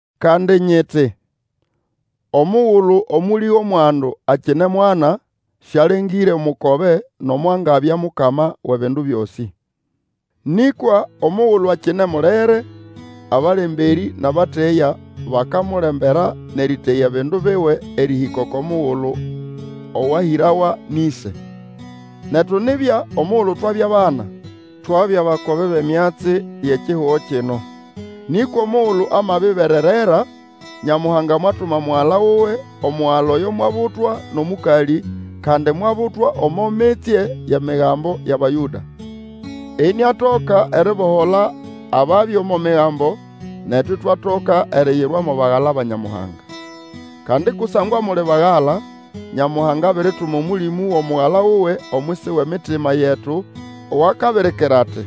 Kandi nyiti, omugulu omũlĩ wʼomwandu akine mwana, sialengĩre omukobe nomo angabya mukama wʼebindu byosĩ. Nĩkwa omugulu akine mulere, abalemberĩ nʼabateya bakamulembera nʼeriteya ebindu biwe erĩhĩka oko mugulu owahĩrawa nʼĩse. Netu nibya omugulu twabya bana, twabya bakobe bʼemyatsi yʼekihugo kino. Nĩkwa omugulu amabiberera, Nyamuhanga mwatuma Omugala wuwe. Omugala oyo mwabutwa nʼomũkalĩ kandi mwabutwa omo mitsye yʼEmigambo yʼAbayũda, iniatoka eribohola ababya omo Migambo, netu itwatoka eriyirwa mo bagala ba Nyamuhanga. Kandi kusangwa muli bagala, Nyamuhanga abirituma Omũlĩmũ wʼomugala wuwe omwisi wʼemitima yetu, owakabirikira ati,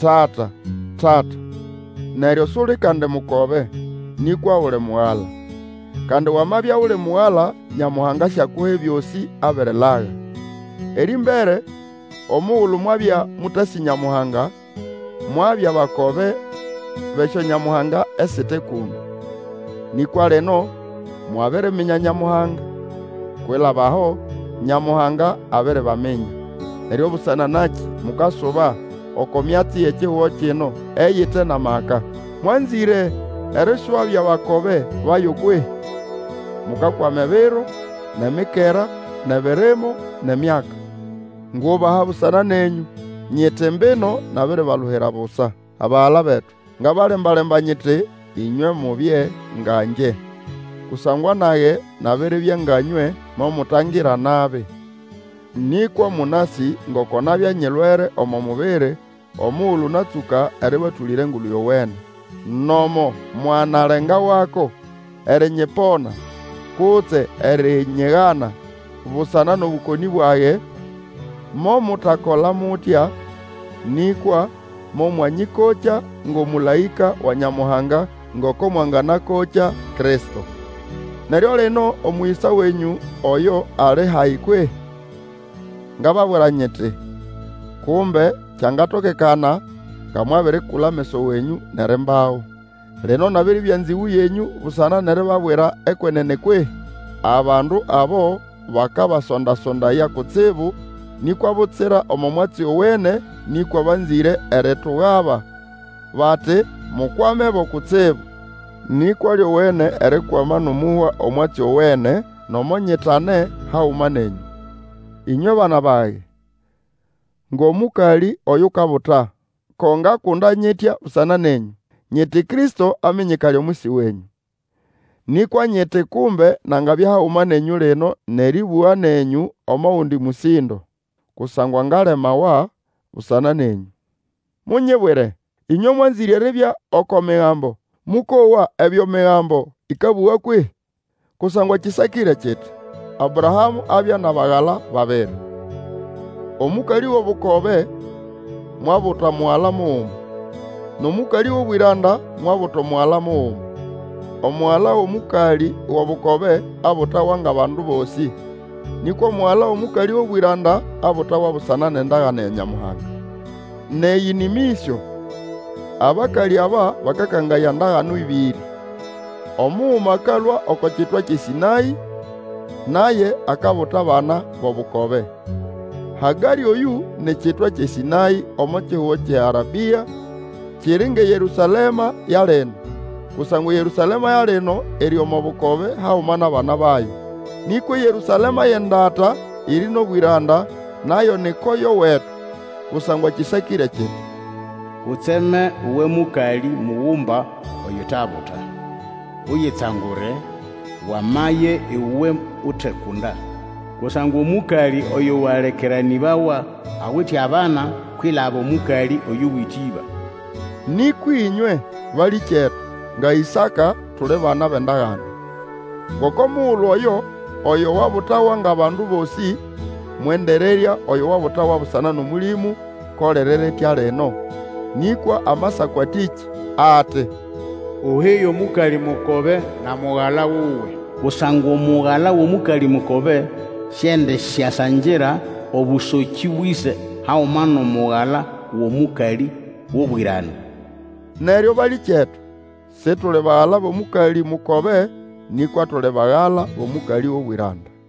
Tata, Tata! Neryo suli kandi mukobe, nĩkwa uli mugala. Kandi wamabya uli mugala, Nyamuhanga asyakuha ebyosĩ abirilaga. Erĩmbere, omugulu mwabya mũtasĩ Nyamuhanga, mwabya bakobe bʼesyonyamuhanga esite kũndũ. Nĩkwa lino mwabiriminya Nyamuhanga. Kwilaba aho, Nyamuhanga abiribaminya. Neryo busana nakĩ mukasuba oko myatsi yʼekihugo kino eyite nʼamaka. Mwanzĩre eriswabya bakobe bayo kwehĩ? Mukakwama ebiro, nʼemikera, nʼebirimo, nʼemyaka. Ngubaha busana nenyũ, nyiti mbino nabiribaluhira busa. Abagala betu, ngabalemba-lemba nyiti ĩnywe mubye nga ngye. Kusangwa nage nabiribya nga nywe, momutangira nabi. Nĩkwa mũnasĩ ngoko nabya nyilwere omo mubiri omugulu natsũka erĩbatũlĩra Engulu Yowene. Nomo mwanalengawako erinyipona kutse erinyigana busana nʼobũkonĩ bwage, momutakola mutya, nĩkwa momwanyĩkokya ngʼomũlaĩka wa Nyamuhanga, ngoko mwanganakokya Kristo. Neryo lino omũyĩsa wenyũ oyo ali hayi kwehĩ? Ngababwira nyiti, kumbe kyangatokekana, nga mwabirikula ameso wenyũ nʼerimbago. Lino nabiribya nzĩgũ yenyũ busana nʼeribabwira ekwenene kwehĩ? Abandu abo bakabasonda-sondaya kutsibu, nikwa butsira omo mwatsi owene, nĩkwa banzĩre eritugaba, bati mukwamebo kutsibu. Nĩkwa lyowene erikwama nʼomũhwa omwatsi owene, nomo nyitane haguma nenyũ. Ĩnywe bana bage, ngʼomũkalĩ Oyukabuta, ko ngakunda nyitya busana nenyũ, nyiti Kristo aminyikale omwisi wenyũ. Nĩkwa nyiti kumbe nangabya haguma nenyũ lino nʼerĩbũga nenyũ omo gundi mũsĩndo. Kusangwa ngalemawa busana nenyũ. Munyibwire, ĩnywe mwanzĩre eribya oko Migambo, mũkowa ebyo Migambo ĩkabũga kwehĩ? Kusangwa kĩsakĩre kiti, Abrahamũ abya nʼabagala babiri. Omũkalĩ wʼobukobe mwabuta mugala muguma, nʼomũkalĩ wʼobwĩranda mwabuta mugala muguma. Omugala wʼomũkalĩ wʼobukobe abutawa ngʼabandu bosĩ, nĩkwa omugala wʼomũkalĩ wʼobwĩranda abutawa busana nʼendagane ya Nyamuhanga. Nʼeyĩ nĩ mĩsyo. Abakalĩ aba bakakangaya ndagano ĩbĩrĩ. Omuguma akalũa oko kitwa kyʼeSĩnaĩ, naye akabuta abana bʼobukobe. Hagarĩ oyũ ni kitwa kyʼeSĩnaĩ omo kihugo kyʼeArabĩa, kiri ngʼeYerũsalema ya lino, kusangwa eYerũsalema ya lino iri omo bukobe haguma nʼabana bayo. Nĩkwa eYerũsalema yʼendata iri nʼobwĩranda, nayo ni koyo wetu. Kusangwa kĩsakĩre kiti, Utseme, uwe mũkalĩ mugumba oyutabuta; Uyitsangure, wamaye, iwe utekunda; Kusangwa omũkalĩ oyũ alekeranĩbawa, awite abana kwilaba Omũkalĩ oyuwite ĩba. Nĩkwa ĩnywe, balĩkyetu, nga Ĩsaka, tuli bana bʼendagane. Ngoko mugulu oyo, oyo wabutawa ngʼabandu bosĩ, mwendererya oyo wabutawa busana nʼOmũlĩmũ, ko liri ritya lino. Nĩkwa Amasako atĩkĩ? Ati, Uhige omũkalĩ mukobe na mugala wuwe. Kusangwa omugala wʼomũkalĩ mukobe, Siendisyasangira obũsokĩ bwʼĩse haguma nʼomugala wʼomũkalĩ wʼobwĩranda. Neryo, balĩkyetu, Situli bagala bʼomũkalĩ mukobe, nĩkwa tuli bagala bʼomũkalĩ gʼobwĩranda.